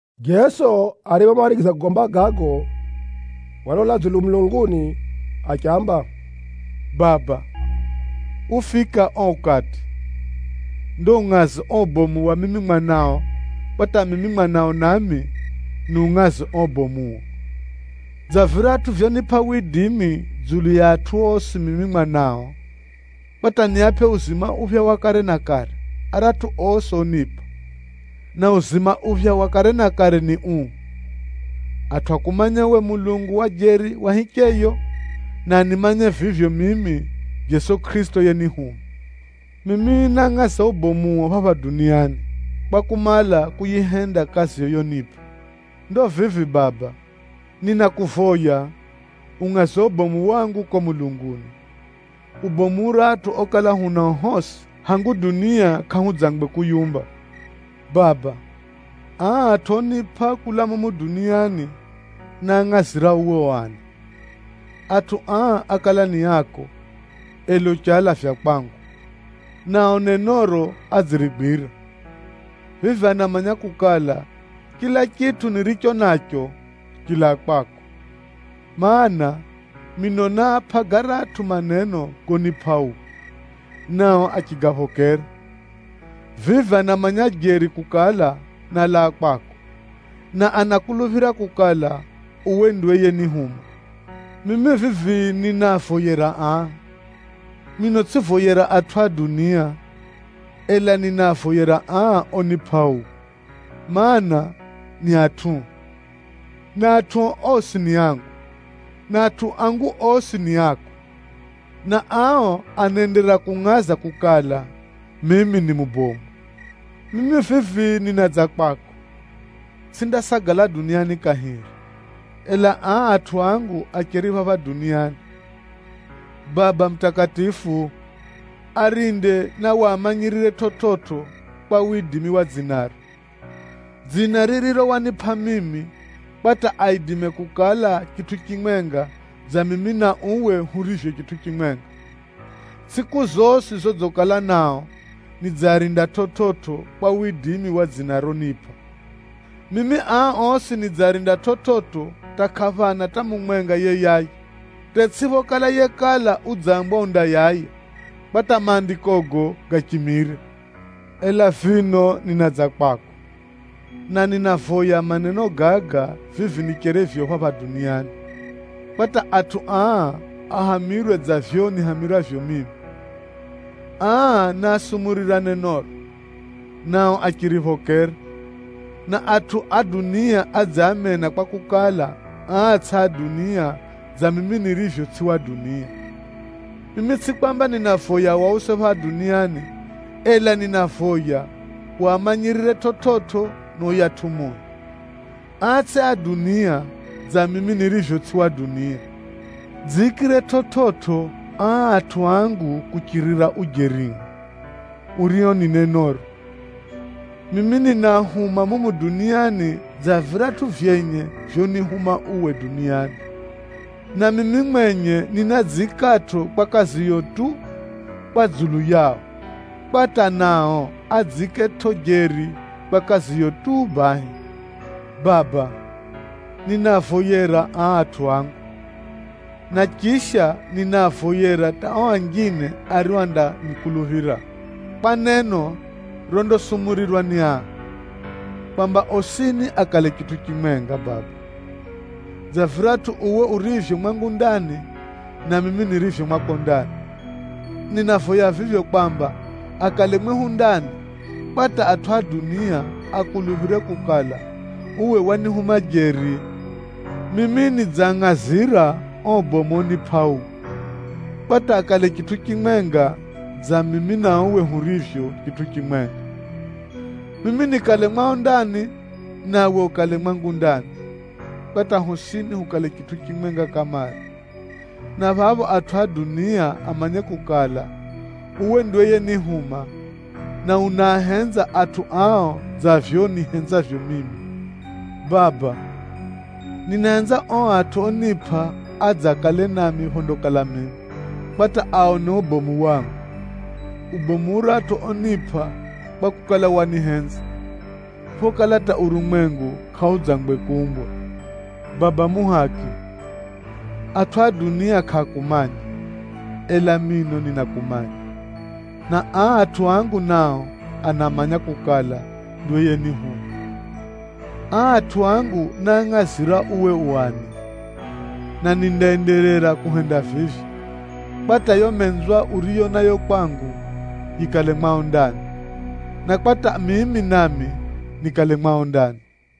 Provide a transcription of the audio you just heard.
Jeso ariphomarigiza kugomba gago, walola dzulu mulunguni achiamba, “Baba, ufika o ukati! Ndo ungʼaze o ubomu wa mimi Mwanao kwa hata mimi Mwanao nami, niungʼaze o ubomuo, dza viratʼu vyonipʼa widimi dzulu ya atʼu osi mimi Mwanao, kwa hata niapʼe uzima uphya wa kare na kare aratʼu osi onipʼa. Na uzima uphya wa kare na kare ni uu: atʼu akumanye uwe Mulungu wa jeri wa hicheyo, na animanye vivyo mimi Jeso Kʼirisito yenihuma. Mimi nángʼaza ubomuo phapha duniani, kwa kumala kuyihenda kaziyo yonipʼa. Ndo vivi Baba, ninakuvoya ungʼaze ubomu wangu ko mulunguni, ubomu uratʼu okala hunao hosi hangu dunia kʼahudzangwe kuyiumba. Baba, aa atʼu onipʼa kulaa mumu duniani, náangʼazira uwe u ani. Atʼu aa ákala ni ako, ela uchialavya kwangu, nao nenoro adzirigwira. Vivi anamanya kukala, chila chitʼu niricho nacho, chilaa kwako. Maana, mino náapʼa garatʼu maneno gonipʼa uwe, nao achigaphokera. Vivi anamanya jeri kukala, nálaa kwako, na anakuluphira kukala, uwe ndiwe yenihuma. Mimi vivi ninaavoyera aa. Mino tsʼivoyera atʼu a dunia, ela ninaavoyera aa onipʼa uwe, mana, ni atʼuo. Na atʼuo osi ni angu, na atʼu angu osi ni ako, na ao anaenderera kungʼaza kukala, mimi ni mubomu. Mimi vivi ninadza kwako, tsʼindasagala duniani kahiri, ela aa atʼu angu acheri phapha duniani. Baba mutakatifu, arinde na wamanyirire chividzo kwa widimi wa dzinaro, dzina ririro wanipʼa mimi, kwa hata aidime kukala chitʼu chimwenga dza mimi na uwe hurivyo chitʼu chimwenga. Tsʼiku zosi zodzikala nao, nidziarinda chividzo kwa widimi wa dzina ronipʼa. Mimi aa osi nidziarinda chividzo hata kʼaphana hata mumwenga yeyaya, hata atsʼiphokala yekala udzambwa undayaya, kwa hata Maandikogo gachimire. Ela vino ninadza kwako, na ninavoya maneno gaga vivi nicherivyo phapha duniani, kwa hata atʼu aa ahamirwe dza vivyo nihamirwavyo mimi. Aa náasumurira nenoro, nao achiriphokera, na atʼu a dunia adziamena kwakukala, aa tsʼi a dunia dza mimi nirivyo tsʼi wa dunia. Mimi tsʼi kwamba ninavoya wause phapha duniani, ela ninavoya wamanyirire chividzo na yuyatʼu Mui. Aa tsʼi a dunia dza mimi nirivyo tsʼi wa dunia. Dziikire chividzo aa atʼu angu kuchirira ujerio, urio ni nenoro. Mimi ninaahuma mumu duniani dza viratʼu vyenye vyonihuma uwe duniani, na mimi mwenye ninadziikatʼo kwa kaziyo tu, kwa dzulu yao, kwa nao adziiketʼo jeri kwa kaziyo tu bahi.” “Baba, ninaavoyera aa atʼu angu, na chisha ninaavoyera hata o anjine ario andanikuluphira kwa neno rondasumurirwa ni aa, kwamba osini akale chitʼu chimwenga Baba, dza viratʼu uwe urivyo mwangu ndani, na mimi nirivyo mwako ndani. Ninavoya vivyo kwamba akale mwehu ndani, kwa hata atʼu a dunia akuluphire kukala, uwe wanihuma jeri. Mimi nidziangʼazira o ubomu onipʼa uwe, kwa hata akale chitʼu chimwenga dza mimi na uwe hurivyo chitʼu chimwenga, mimi nikale mwao ndani, nawe ukale mwangu ndani, kwa hata hosini hukale chitʼu chimwenga kamare, na phapho atʼu a dunia amanye kukala, uwe ndiwe yenihuma, na unaahenza atʼu ao dza vivyo unihenzavyo mimi. Baba! Ninahenza o atʼu onipʼa adze akale nami phondakala mimi, kwa hata aone ubomu wangu, ubomu uratʼu onipʼa kwakukala, wanihenza, phokala hata urumwengu kʼaudzangwe kuumbwa. Baba muhaki, atʼu a dunia kʼaakumanya, ela mino ninakumanya, na aa atʼu angu nao anamanya kukala, ndiwe yenihuma. Aa atʼu angu náangʼazira uwe u ani, na nindaenderera kuhenda vivyo, kwa hata yo menzwa uriyo nayo kwangu yikale mwao ndani, na kwa hata mimi nami nikale mwao ndani.”